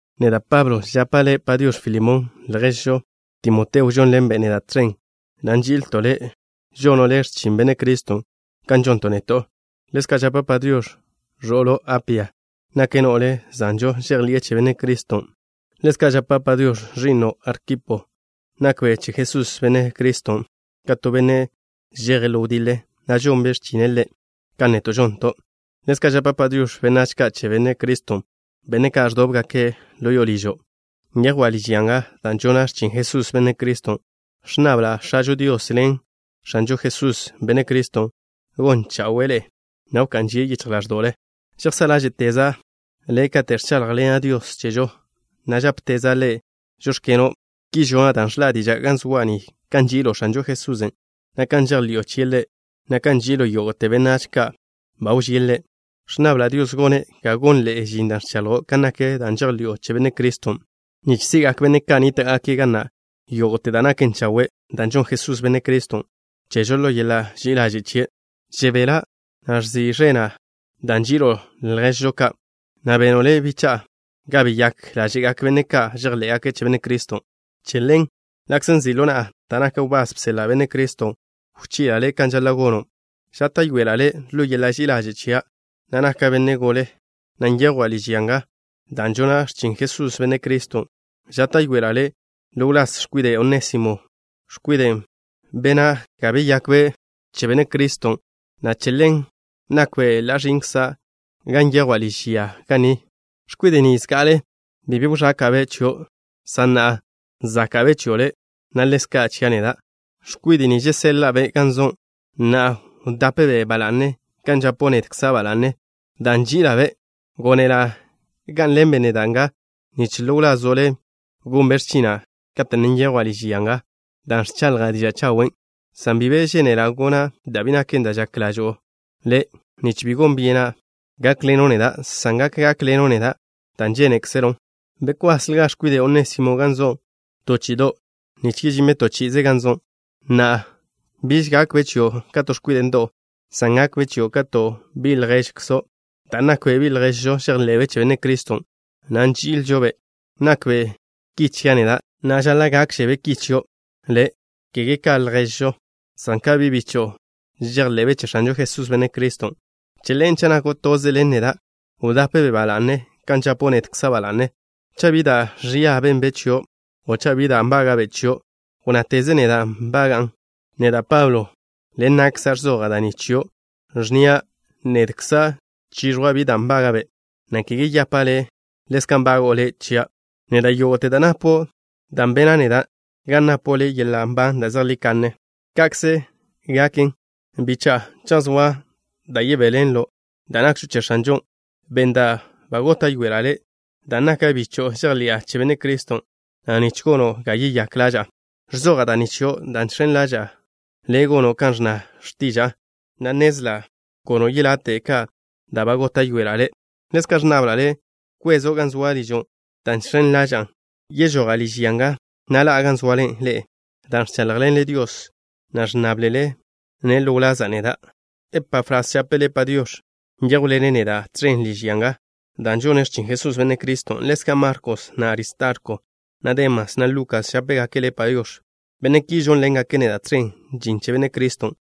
Neda', Pablo, žapa' le' “Padiox̱” Filemón. Lježžo, Timoteo žonḻenbe' neda' tẕen, na' nži'ilto' le'. Žono' le' x̱chin Benne' Criston' kan žonton' neto'. Ḻezka' žapa' “Padiox̱” ẕo'lo', Apia. Nake' no'le zanžo žejḻi'e che Benne' Criston'. Ḻezka' žapa' “Padiox̱” ẕi'no', Arkipo. Nakbe' che Jesús, Benne' Criston', ka to benne' žeje' ḻo wdiḻe, na' žonbe' x̱chine' Ḻe' kan neto' žonton'. Ḻezka' žapa' “Padiox̱” benách ka' che Benne' Criston', benne' ka' ẕdóbgake' ḻo ližo'. Nyejwa' liž ya nga dan' žona' x̱chin Jesús, Benne' Criston'. Ẕnnabla' X̱ažo Dios ḻen X̱anžo Jesús, Benne' Criston', gon chawe'e ḻe'e, na' wká'n žie' yichj ḻáẕdo'le. Žejsá' ḻáže'teza' le' kate' ẕcháḻjḻena' Dios chežo, na' žápeteza' Ḻe': “Žóx̱keno'.” Ki žona' dan' ẕžin diža' ga zoa' ni kan nži'ilo' X̱anžo Jesusen', na' kan žejḻi'o chie' Ḻe', na' kan nži'ilo' yógo'te benách ka' ba wžíe' Ḻe'. Ẕnnabla' Dios gone' ga gonḻe'e žin da' ẕchaḻjo' kan nak da' žejḻi'o che Benne' Criston', nich si'gak benne' ka' nníta'gake' ga na' yógo'te da' naken chawe', da' žonn Jesús, Benne' Criston', chežo ḻo yeḻa' ži'i ḻaže' chie'. Žebela', na' ẕzi' ẕena' dan' nži'ilo' lježžo ka', na' beno' le', bicha'a, ga beyák ḻáže'gak benne' ka' žejḻé'gake' che Benne' Criston'. Che ḻen, ḻa'kze nzi' ḻo na'a, dan' naka' wbás bseḻa' Benne' Criston', wchi'la' le' kan žaḻa' gono', žáta'yoela' le' ḻo yeḻa' ži'i ḻaže' chia', na' naka' benne' gole, na' nyejwa' liž ya nga dan' žona' x̱chin Jesús, Benne' Criston'. Žáta'yoela' le' ḻo wláz x̱kwide' Onésimo, x̱kwiden' bena' ga beyakbe' che Benne' Criston', na' che ḻen nakbe' ka ẕi'nkza' ga nyejwa' liž ya ni. X̱kwide' ni, zga'ale bi be wzáka'be' chio', san na'a záka'be' chio' le', na' ḻezka' chia' neda'. X̱kwide' ni žeseḻa'a-be' gan zo'. Na'a, wdape-be' ba la'ne kan žapo' nedkza' ba la'ne, dan' nži'ila'-be'. Gónela' gá'nḻenbe' neda' nga, nich ḻo wlazo' le' gonbe' x̱china' kate' ne nyejwa' liž ya nga dan' ẕchaḻja' diža' chawen', san bi be žénela' gona' da' bi naken da' žak ḻažo'o le', nich bi gon byena' gákḻeno' neda', san gak gákḻeno' neda' dan' žénekzelon'. Bkwasljga x̱kwide' Onésimo gan zo' to chi'ido' nich yežinbe' to chi'ize gan zo'. Na'a, biž gakbe' chio' ka to x̱kwide' ndo'w, san gakbe' chio' ka to bi' lježkzo', dan' nakbe' bi' lježžo žejḻe'be' che Benne' Criston', na' nži'ilžo-be'. Nakbe' ki chia' neda', na' žaḻa' gákžebe' ki chio' le', kege ka lježzo', san ka bi' bicho'o žejḻe'be' che X̱anžo Jesús, Benne' Criston'. Che ḻen, cha' nako' toze ḻen neda', wdape-be' ba la'ne kan žapo' nedkza' ba la'ne. Cha' bi da' ẕia benbe' chio' o cha' bi da' nbága'be' chio', wnnáteze neda' nbaga'an. Neda', Pablo, ḻen na'kza' ẕzoja' da' ni chio', ẕnnia': nedkza' chiẕjwa' bi da' nbága'be', na' kege yapa' le': ḻezka' nbago'o le' chia' neda' yógo'te da' napo' dan' bena' neda' ga napo' le' yeḻa' nban da' zejlí kanne. Ka'kze gaken, bicha'a. Cha' zoa da' yebéḻenlo' dan' nakžo che X̱anžon', ben da' ba góta'yoela' le' dan' naka' bicho'o žejḻi'a che Benne' Criston', na' nich gono' ga yeyák ḻaža'a. Ẕzoja' da' ni chio', dan' žx̱en ḻaža'a le', gono' kan ẕnna x̱tiža'a, na' nnezla' gono' yelate' ka da' ba góta'yoela' le'. Ḻezka' ẕnnabla' le' wkwezo' gan soa' ližo', dan' žx̱en ḻaža'a yežoja' liž ya nga, na' ḻa'a gan zoale ḻe'e dan' ẕcháḻjḻenle Dios, na' ẕnnáblele-ne' ḻo wlaza' neda'. Epafras žape' le' “Padiox̱.” Nyéjwḻene' neda' tẕen liž ya nga dan' žone' x̱chin Jesús, Benne' Criston'. Ḻezka' Markos, na' Aristarko, na' Demas, na' Lukas, žápegake' le' “Padiox̱.” Benne' ki žónḻengake' neda' tẕen žin che Benne' Criston'.